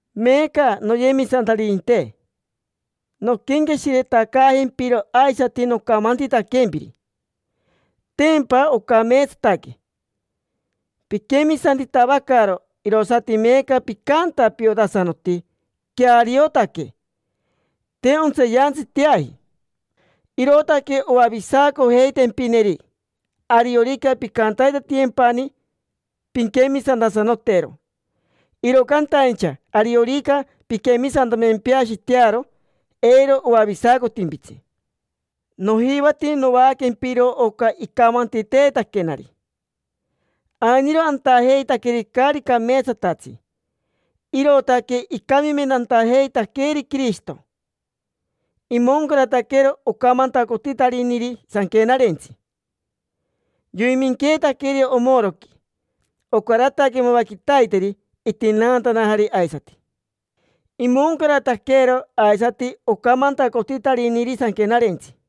Meeca, noyemisantaririnte, nonquenqueshiretacaajempiro aisati nocamantitaquempiri: tempa ocameetsataque, piquemisantitavacaro; irosati meeca picanta piotasanoti queariotaque, te ontseeyantsiteaji. Irootaque oavisacojeitempineri, ariorica pincantatiyempani pinquemisantasanotero. Iro cantaincha ariorica pinquemisantamempeashitearo, eiro oavisacotimpitsi. Nojivati novaaquempiro oca icamantiteetaquenari: ainiro antajeitaqueri caari cameetsatatsi, irootaque icamimentantajeitaqueeri Quirishito. Imoncarataquero ocamantacotitariniri Sanquenarentsi. Yoiminqueetaqueri omoroqui. Ocarataque mava quitaiteri itinaantanajari aisati. Imoncarataquero aisati ocamantacotitariniri Sanquenarentsi.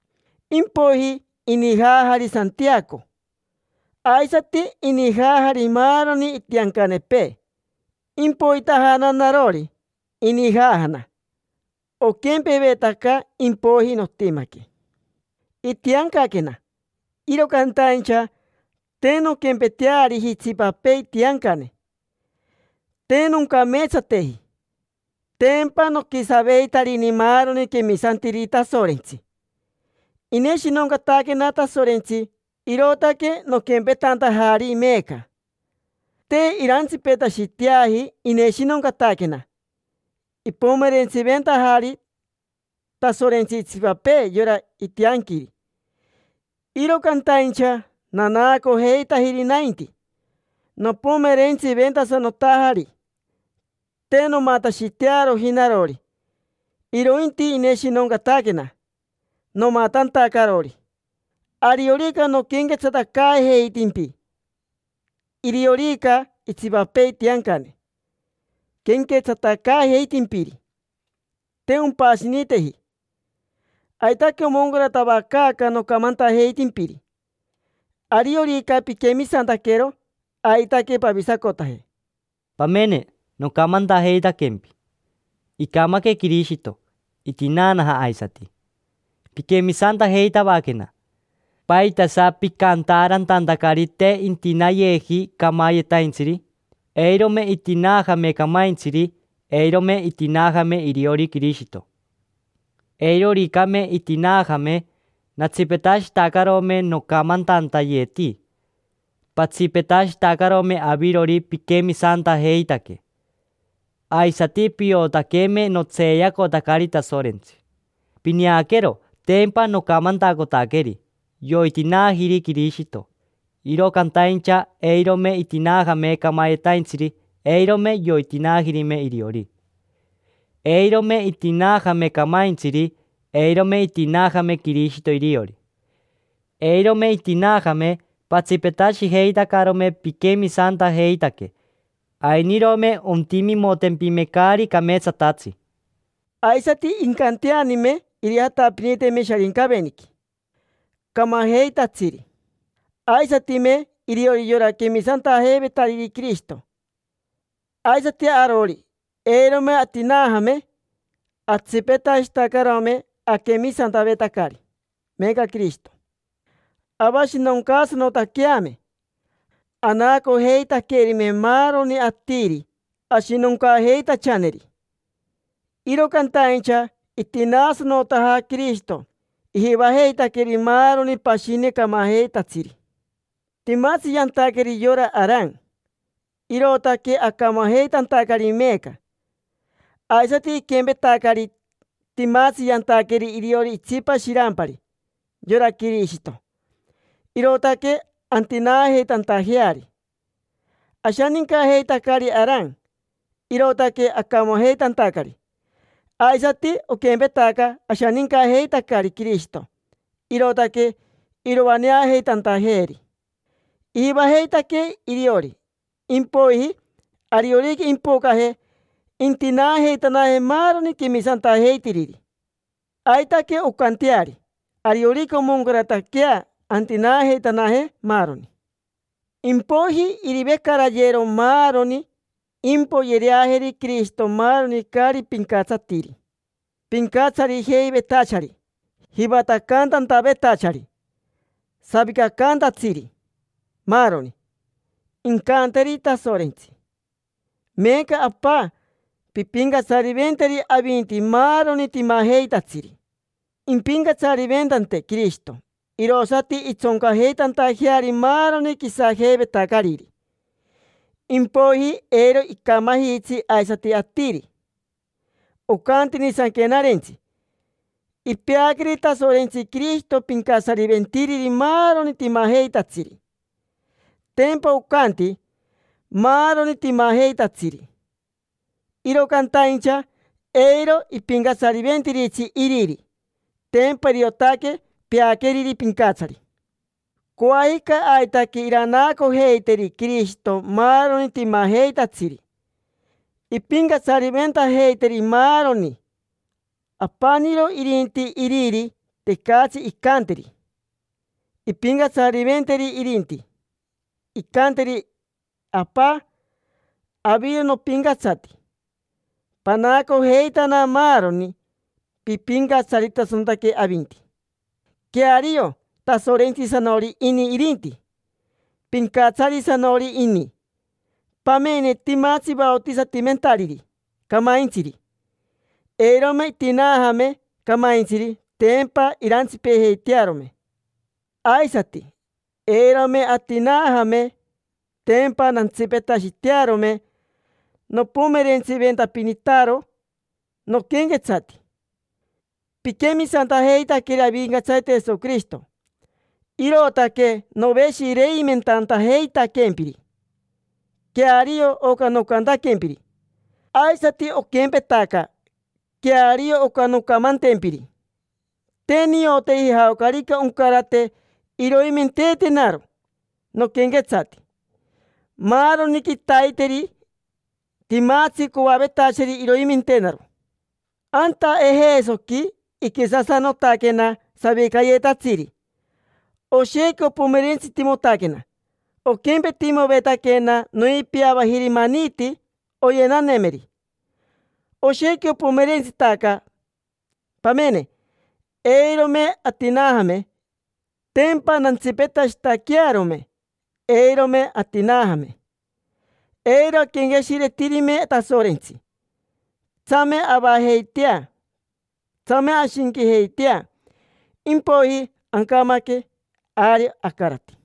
Impoiji inijaajari Santiaco, aisati inijaajari maaroni itiancanepee. Impoitajana narori, inijaajana. Oquempevetaca impoiji notimaque. Itiancaquena, iro cantaincha te nonquempeteariji itsipapee itiancane, te noncameetsateji: tempa noquisaveitarini maaroni quemisantiriri Tasorentsi. Ineshinoncataquena Tasorentsi, irootaque noquempetantajari meeca. Te irantsipetashiteaji ineshinoncataquena. Ipomerentsiventajari Tasorentsi itsipapee yora itianquiri, iro cantaincha nanaacojeitajiri nainti, nopomerentsiventasanotajari. Te nomatashitearoji narori, irointi ineshinoncataquena, nomatantacarori. Ariorica noquenquetsatacaajeitimpi, iriorica itsipapee itiancane quenquetsatacaajeitimpiri: te ompashiniteji. Aitaque omoncaratavacaaca nocamantajeitimpiri: ariorica piquemisantaquero, aitaque pavisacotaje. Pamene, nocamantajeitaquempi: “Icamaque Quirishito, itinaanaja aisati”. Piquemisantajeitavaquena. ¿Paitasa picantaarantantacari te intinaayeji camayetaintsiri? Eirome itinaajame camaintsiri, eirome itinaajame iriori Quirishito. Eiroricame itinaajame, natsipetashitacarome nocamantantayeti, patsipetashitacarome avirori piquemisantajeitaque. Aisati piotaqueme notseeyacotacari Tasorentsi. Pineaquero, tempa nocamantacotaqueri: “Yoitinaajiri Quirishito”, iro cantaincha eirome itinaajame camayetaintsiri, eirome yoitinaajirime iriori. Eirome itinaajame camaintsiri, eirome itinaajame Quirishito iriori. Eirome itinaajame, patsipetashijeitacarome piquemisantajeitaque; ainirome ontimimotempime caari cameetsatatsi, aisati incanteanime irijatapiniteme Sharincaveniqui camajeitatsiri, aisatime iriori yora quemisantajeivetariri Quirishito. Aisati arori, eirome atinaajame, atsipetashitacarome aquemisantavetacari meeca Quirishito, avashinoncaasanotaqueame, anaacojeitaquerime maaroni atiri ashinoncaajeitachaneri. Iro cantaincha itinaasanotaja Quirishito, ijivajeitaqueri maaroni pashini camajeitatsiri. Timatsi yantaqueri yora Aran, irootaque acamajeitantacari meeca. Aisati iquempetacari, timatsi yantaqueri iriori itsipa shirampari, yora Quirishito, irootaque antinaajeitantajeari. Ashanincajeitacari Aran, irootaque acamajeitantacari. Aisati oquempetaca, ashanincajeitacari Quirishito, irootaque iroaneajeitantajeeri. Ijivajeitaquee iriori. Impoiji, ariorica impocaje, intinaajeitanaje maaroni quemisantajeitiriri. Aitaque oncanteari: ariorica omoncarataquea, antinaajeitanaje, maaroni. Impoiji irivecarayero maaroni, impoyereajeri Quirishito maaroni caari pincatsatiri: pincatsarijeivetachari, jivatacantantavetachari, savicacaantatsiri, maaroni. Incanteri Tasorentsi: “Meeca, Apa, pimpincatsariventeri avinti maaroni timajeitatsiri”. Impincatsariventante Quirishito irosati intsoncajeitantajeari maaroni quisajeivetacariri. Impoiji eiro icamajitsi aisati atiri. Ocantini Sanquenarentsi: “Ipeaqueri Tasorentsi Quirishito pincatsariventiriri maaroni timajeitatsiri”. Tempa ocanti: “Maaroni timajeitatsiri”, iro cantaincha eiro ipincatsariventiritsi Iriri: tempa iriotaque peaqueriri pincatsari. Coajica aitaque iranaacojeiteri Quirishito maaroni timajeitatsiri, impincatsariventajeiteri maaroni. Apaniro irinti Iriri, tecatsi incanteri impincatsariventeri irinti. Incanteri: “Apa, aviro nopincatsati, panaacojeitana maaroni, pipincatsaritasanotaque avinti”. Queario, Tasorentsisanori ini irinti, pincatsarisanori ini. Pamene, timatsi vaotisatimentariri camaintsiri. Eirome itinaajame camaintsiri, tempa irantsipejeitearome. Aisati, eirome atinaajame, tempa nantsipetashitearome nopomerentsiventapinitaro noquenquetsati. Piquemisantajeitaqueri Avincatsarite Jesoquirishito, irootaque noveshireimentantajeitaquempiri: queario oca nocantaquempiri. Aisati oquempetaca, queario oca noncamantempiri: te nioteji jaocarica oncarate iroimenteetenaro noquenquetsati. Maaroni quitaiteri timatsi coavetachari iroimentenaro. Anta Ejesoqui iquisasanotaquena savicayetatsiri, oshequi opomerentsitimotaquena. Oquempetimovetaquena noipiavajiri maniti oyenanemeri. Oshequi opomerentsitaca. Pamene, eirome atinaajame, tempa nantsipetashitaquearome. Eirome atinaajame, eiro aquenqueshiretirime Tasorentsi: tsame avajeitea, tsame ashinquijeitea; impoiji ancamaque, ari acarati.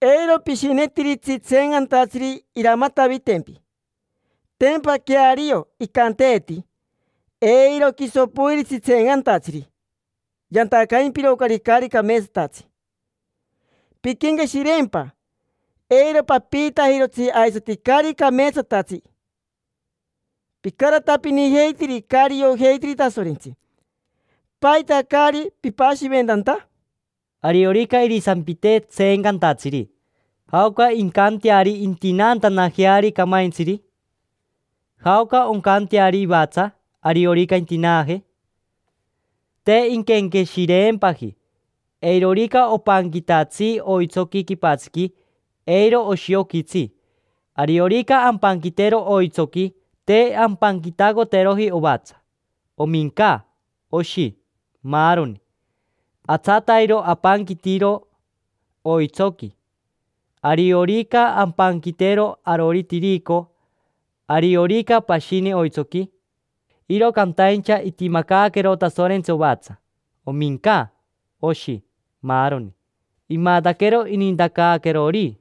Eiro pishinetiritsi tseencantatsiri iramatavitempi. Tempa queario icanteeti: “Eiro quiso poiritsi tseencantatsiri: yantacaimpirocari caari cameetsatatsi”. Pinquenqueshireempa, eiro papiitajirotsi aisati caari cameetsatatsi. Picaratapinijeitiri caari iojeitiri Tasorentsi: ¿paita caari pipashiventanta? Ariorica irisampitee tseencantatsiri: “¿Jaoca incanteari intinaantanajeari camaintsiri? ¿Jaoca oncanteari ivatsa, ariorica intinaaje?” Te inquenqueshireempaji. Eirorica opanquitatsi oitsoqui quipatsiqui, eiro oshioquitsi. Ariorica ampanquitero oitsoqui, te ampanquitacoteroji ovatsa, ominca, oshi, maaroni: atsatairo apanquitiro oitsoqui. Ariorica ampanquitero arori tirico, ariorica pashini oitsoqui, iro cantaincha itimacaaquero Tasorentsi ovatsa, ominca, oshi, maaroni; imataquero inintacaaquerori.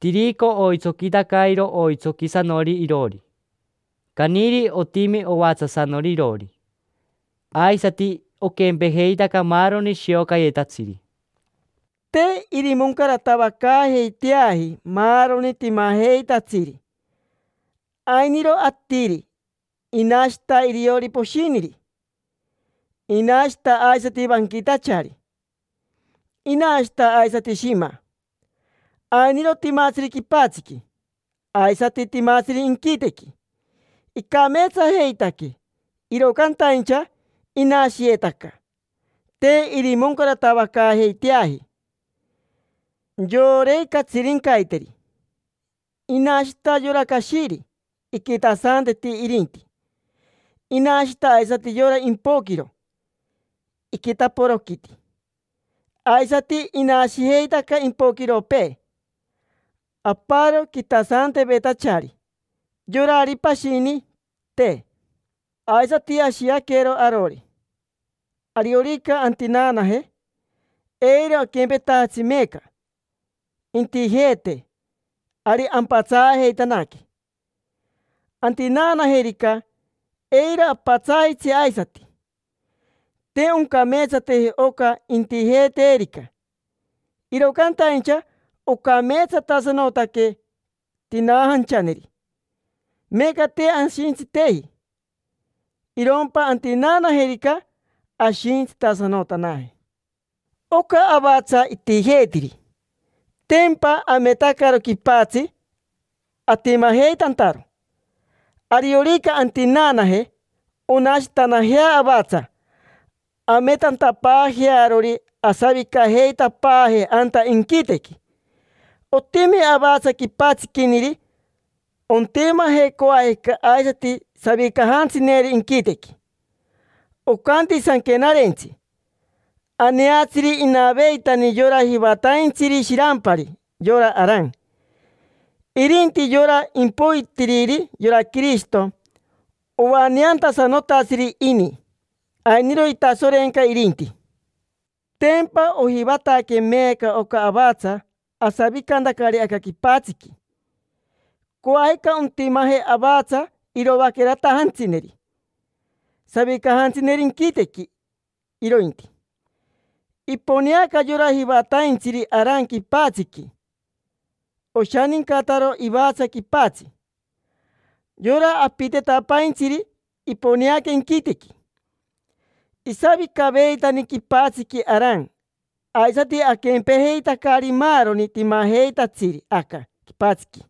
Tirico oitsoquitacairo oitsoquisanori iroori. Caniri otimi ovatsasanori iroori. Aisati oquempejeitaca maaroni shiocayetatsiri. Te irimoncaratavacaajeiteaji maaroni timajeitatsiri. Ainiro atiri, inashita iriori poshiniri. Inashita aisati vanquitachari. Inashita aisati shima. Ainiro timatsiri quipatsiqui, aisati timatsiri inquitequi. Icameetsajeitaque, iro cantaincha inashiyetaca, te irimoncaratavacaajeiteaji. Iporei catsirincaiteri. Inashita yora cashiri, iquitasanteti irinti. Inashita aisati yora impoquiro, iquitaporoquiti. Aisati inashijeitaca impoquiropee: aparo quitasantevetachari, yorari pashini, te. Aisati ashiaquero arori, ariorica antinaanaje: eiro aquempetajatsi meeca. Intijeetee, ari ampatsaajeitanaque. Antinaajerica, eiro apatsaajitsi aisati. Te oncameetsateji oca intijeeterica, iro cantaincha oncameetsatasanotaque tinaajanchaneri. Meeca te ashintsiteji, irompa antinaanajerica, ashintsitasanotanaje. Oca avatsa itijeetiri, tempa ametacaro quipatsi atimajeitantaro. Ariorica antinaanaje, onashitanajea avatsa, ametantapaajearori asavicajeitapaaje anta inquitequi. Otimi avatsa quipatsiquiniri, ontimaje coajica aisati savicajantsineri inquitequi. Ocanti Sanquenarentsi: “Aneatsiri inaveitani yora jivataintsiri shirampari, yora Aran”. Irinti yora impoitiriri, yora Quirishito, oaneantasanotatsiri ini, ainiro itasorenca irinti. Tempa ojivataque meeca oca avatsa asavicantacari aca quipatsiqui; coajica ontimaje avatsa iroaqueratajantsineri, savicajantsineri inquitequi, irointi. Iponeaca yora jivataintsiri Aran quipatsiqui, oshanincataro ivatsa quipatsi. Yora apitetapaintsiri iponeaca inquitequi. Isavicaveitani quipatsiqui Aran, aisati aquempejeitacari maaroni timajeitatsiri aca quipatsiqui.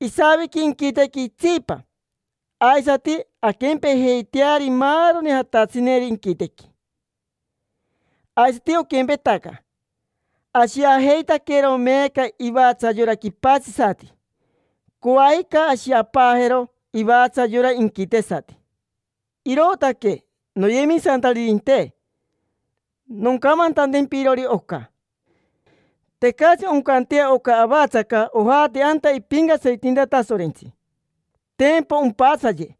Isaviqui inquitequi itsipa, aisati anquempejeiteari maaroni jatatsineri inquitequi. Aisati oquempetaca: ashiajeitaquero meeca ivatsa yora quipatsisati, coajica ashiapaajero ivatsa yora inquitesati. Irootaque, noyemisantaririnte, noncamantantempirori oca: tecatsi oncantea oca avatsaca ojate anta ipincatsaritinta Tasorentsi, tempa ompatsaye.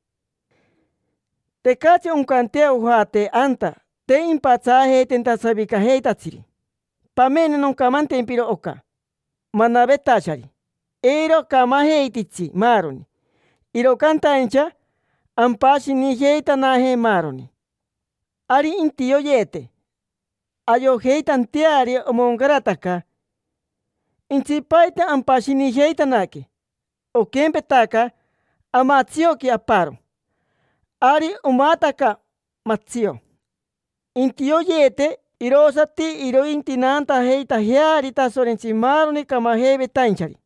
Tecatsi oncantea ojate anta te impatsaajeitenta savicajeitatsiri. Pamene, noncamantempiro oca manavetachari: eiro acamajeititsi maaroni, iro cantaincha ampashinijeitanaje maaroni. Ari intioyeete, ayojeitanteari omoncarataca. Intsipaite ampashinijeitanaque, oquempetaca amatsioqui aparo, ari omataca, matsio. Intioyeete, irosati irointinaantajeitajeari Tasorentsi maaroni camajeivetainchari;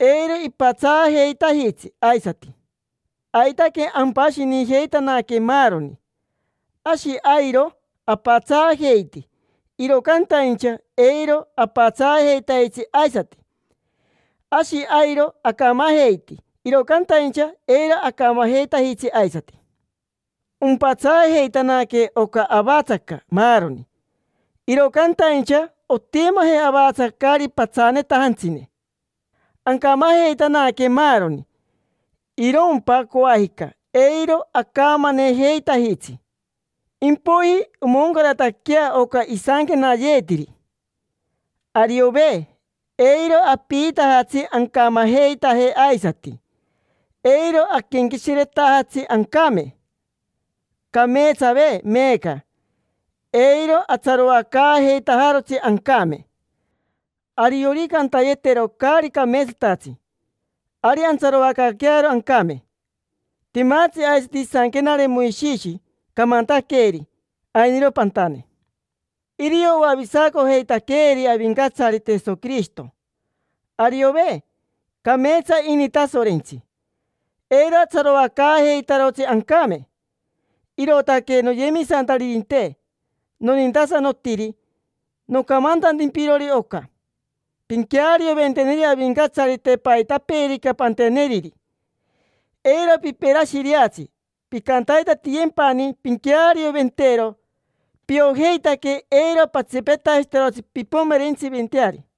eiro ipatsaajeitajitsi aisati. Aitaque, ampashinijeitanaque maaroni. Ashi airo apatsaajeiti, iro cantaincha eiro apatsaajeitajitsi aisati. Ashi airo acamajeiti, iro cantaincha eiro acamajeitajitsi aisati. Ompatsaajeitanaque oca avatsaca maaroni, iro cantaincha ontimaje avatsa caari patsaanetajantsine. Ancamajeitanaque maaroni, irompa coajica, eiro acamanejeitajitsi. Impoiji omoncarataquea oca isanquenayeetiri: “Ariove. Eiro apiitajatsi ancamajeitaje aisati. Eiro aquenqueshiretajatsi ancame. Cameetsave. Meeca eiro atsaroacaajeitajarotsi ancame”. Ariorica antayetero caari cameetsatatsi, ari antsaroacaaquearo ancame. Timatsi aisati isanquenare Moishishi, camantaqueeri: “Ainiro pantane”. Irio oavisaacojeitaqueeri Avincatsarite Jesoquirishito. Ariove. Cameetsa ini Tasorentsi. Eiro atsaroacaajeitarotsi ancame. Irootaque, noyemisantaririnte nonintasanotiri, noncamantantempirori oca: pinquearioventeneri Avincatsarite paitapeerica panteneriri, eiro piperashireatsi, pincantatiyempani pinquearioventero. Piojeitaque eiro patsipetashitarotsi pimpomerentsiventeari.